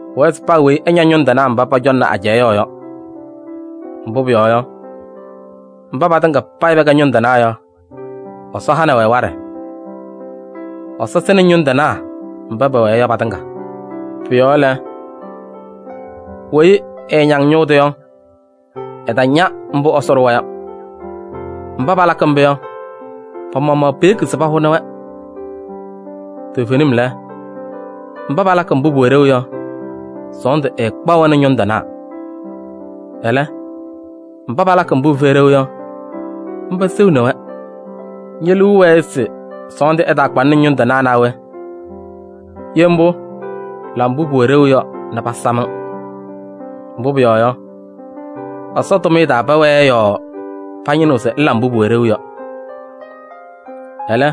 Pʋwɛɛ se paa weyi ɛña ñʋŋ tɩnaa mba pɔcɔŋnɩ ajɛɛ yɔɔ yɔ. Mbʋ pʋyɔɔ yɔ, mba patɩŋa payɩ pɛkɛ ñʋŋ tɩnaa yɔ, Ɛsɔ hanɩ-wɛ waɖɛ. Ɛsɔ sɩnɩ ñʋŋ tɩnaa mba pɛwɛɛ yɔ patɩŋa. Pʋ-yɔɔ lɛ, weyi ɛɛñaŋ ñʋʋ tʋ yɔ, ɛtaña mbʋ Ɛsɔ ɖʋwa yɔ. Mba palakɩ mbʋ yɔ, pa-maɣmaɣ peyeki se pahʋnɩ-wɛ. Toovenim lɛ, mba palakɩ mbʋ pʋwɛ ɖeu yɔ, sɔɔndʋ ɛɛkpaɣ-wɛ nɛ ñʋŋ tɩnaa. Ɛlɛ, mba palakɩ mbʋ pɩfɛyɩ ɖeu yɔ, mba seɣni-wɛ. Ñe-liu wɛɛ se sɔɔndʋ ɛtaakpa-ŋ nɛ ñʋŋ tɩnaa naa we? Ye mbʋ, la mbʋ pʋwɛ ɖeu yɔ nɛ pasam-ŋ. Mbʋ pʋyɔɔ yɔ, Ɛsɔ tʋmɩyɛ taa pɛwɛɛ yɔɔ pañɩnɩɣ se ŋla mbʋ pʋwɛ ɖeu. Ɛlɛ,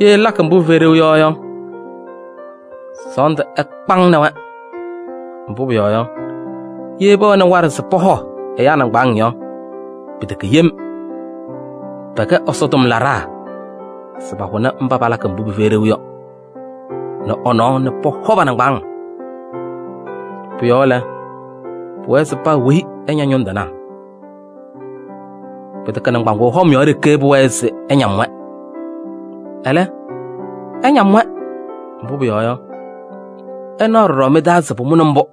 ye ŋlakɩ mbʋ pɩfɛyɩ ɖeu yɔ yɔ, sɔɔndʋ ɛkpa-ŋ nɛ wɛ. Mbʋ pʋyɔɔ yɔ, ye pɛwɛnɩ waɖɛ se pɔhɔ ɛyaa nɩŋgbaaŋ yɔ, pɩtɛkɛ yem: pɛkɛ Ɛsɔ tʋmlaɖaa se pahʋnɩ mba palakɩ mbʋ pɩfɛyɩ ɖeu yɔ nɛ ɛ-nɔɔ nɛ pɔhɔ pa-nɩŋgbaaŋ. Pʋ-yɔɔ lɛ, pʋwɛɛ se paa weyi ɛña ñʋŋ tɩnaa. Pɩtɛkɛ nɩŋgbaŋʋʋ hɔm yɔɔ ɖeke pʋwɛɛ se ɩñam-wɛ. Ɛlɛ, ɩñam-wɛ, mbʋ pʋyɔɔ yɔ, ɩnaɣ ɖɔɖɔ mɩ-taa se pʋmʋnɩ mbʋ.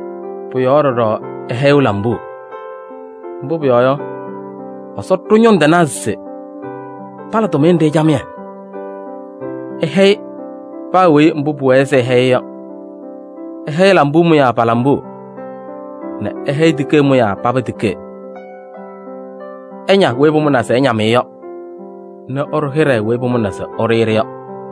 Pʋ-yɔɔ ɖɔɖɔ ɩhɛyɩɣ lambuu. Mbʋ pʋyɔɔ yɔ, Ɛsɔ ɖʋ ñʋŋ tɩnaa se pala tʋmɩyɛ nɖɩ camɩyɛ. Ɩhɛyɩ paa weyi mbʋ pʋwɛɛ se ɩhɛyɩ-ɩ yɔ. Ɩhɛyɩ lambuu mʋyaa pa-lambuu nɛ ɩhɛyɩ tikee mʋyaa paba tikee. Ɩña weyi pʋmʋnaa se ɩñam-ɩ yɔ nɛ ɩɖʋ hɩɖɛ weyi pʋmʋnaa se ɩɖʋ-ɩ-ɖɩ yɔ.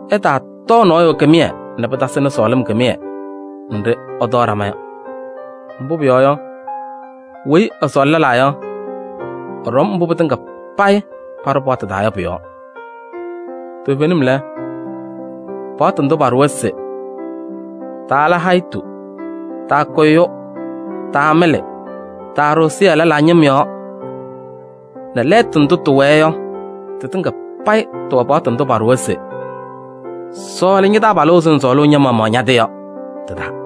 Ɩtaatɔɔ nɔɔyʋ kɩmɩyɛ nɛ pɩtasɩnɩ sɔɔlɩm kɩmɩyɛ nɖɩ ɩtɔɔ ɖama yɔ. Mbʋ pʋyɔɔ yɔ, weyi ɛsɔɔlɩ lɛlaa yɔ, ɛɖɔm mbʋ pɩtɩŋa payɩ paɖʋ paɣtʋ taa yɔ pʋ-yɔɔ. Toovenim lɛ, paɣtʋ ndʋ paɖʋwa se: taala hayitu, taakʋ ɛyʋ, taamɩlɩ, taaɖʋ ɛzɩyɛ lɛlaa ñɩm yɔɔ nɛ lɛɛtʋ ndʋ tɩwɛɛ yɔ tɩtɩŋa payɩ tɩwɛ paɣtʋ ndʋ paɖʋwa se: sɔɔlɩ ña-taabalʋ ɛzɩ ŋsɔɔlʋʋ ña-maɣmaɣ ña-tɩ yɔ tɩ-taa.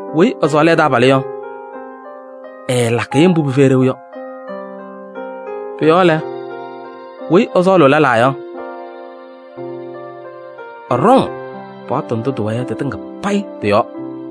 Weyi ɛsɔɔlɩ ɛ-taabalʋ yɔ, ɛɛlakɩ-ɩ mbʋ pɩfɛyɩ ɖeu yɔ. Pʋ-yɔɔ lɛ, weyi ɛsɔɔlʋʋ lɛlaa yɔ, ɛɖɔŋ paɣtʋ ndʋ tɩwɛɛ yɔ tɩtɩŋa payɩ tɩ-yɔɔ.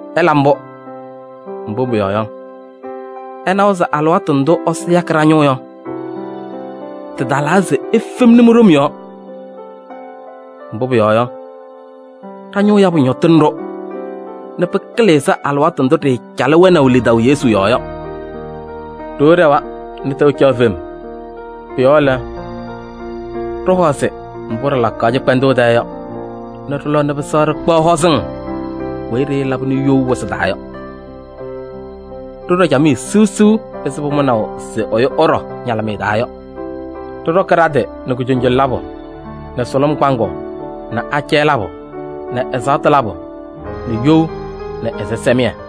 Ɩla mbʋ, mbʋ pʋyɔɔ yɔ, ɩnawa se alɩwaatʋ ndʋ Ɛsɔ yakɩ ɖa-ñʋʋ yɔ, tɩtalaa se ifemni mi-ɖom yɔɔ. Mbʋ pʋyɔɔ yɔ, ɖa-ñʋʋ yabʋ ñɔtɩnɩ-ɖʋ nɛ pɩkɩlɩ ɛzɩ alɩwaatʋ ndʋ ɖɩɩcalɩ wɛnaʋ lidaʋ Yesu yɔɔ yɔ. Ɖoo ɖɛwa nɛ tɛʋ caɣ fem. Pʋ-yɔɔ lɛ, ɖɩhɔzɩ mbʋ ɖɩlakaɣ cɩkpɛndʋʋ taa yɔ nɛ ɖɩlɔ nɛ pɩsɛɣ ɖɩkpaɣ hɔzɩŋ weyi ɖɩɩlabɩnɩ you wɩsɩ taa yɔ. Ɖɩɖɔ camɩyɛ siɣsiɣ ɛzɩ pʋmʋnaʋ se ɛyʋ ɛɖɔ ñalɩmɩyɛ taa yɔ. Ɖɩɖɔkɩ ɖa-tɩ nɛ kujoŋjoŋ labʋ nɛ sʋlʋm kpaŋʋʋ nɛ acɛyɛ labʋ nɛ ɛzaɣtʋ labʋ nɛ you nɛ ɛzɩsɛmɩyɛ.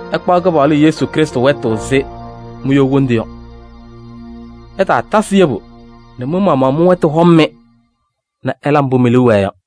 Ɩkpaɣ Kɩpaɣlʋ Yesu Krɩstʋ wɛtʋ ɛzɩ mi-you wondu yɔ. Ɩtaatasɩ yebu nɛ mɩ-maɣmaɣ mɩ-wɛtʋ hɔm-mɩ nɛ ɩla mbʋ mi-liu wɛɛ yɔ.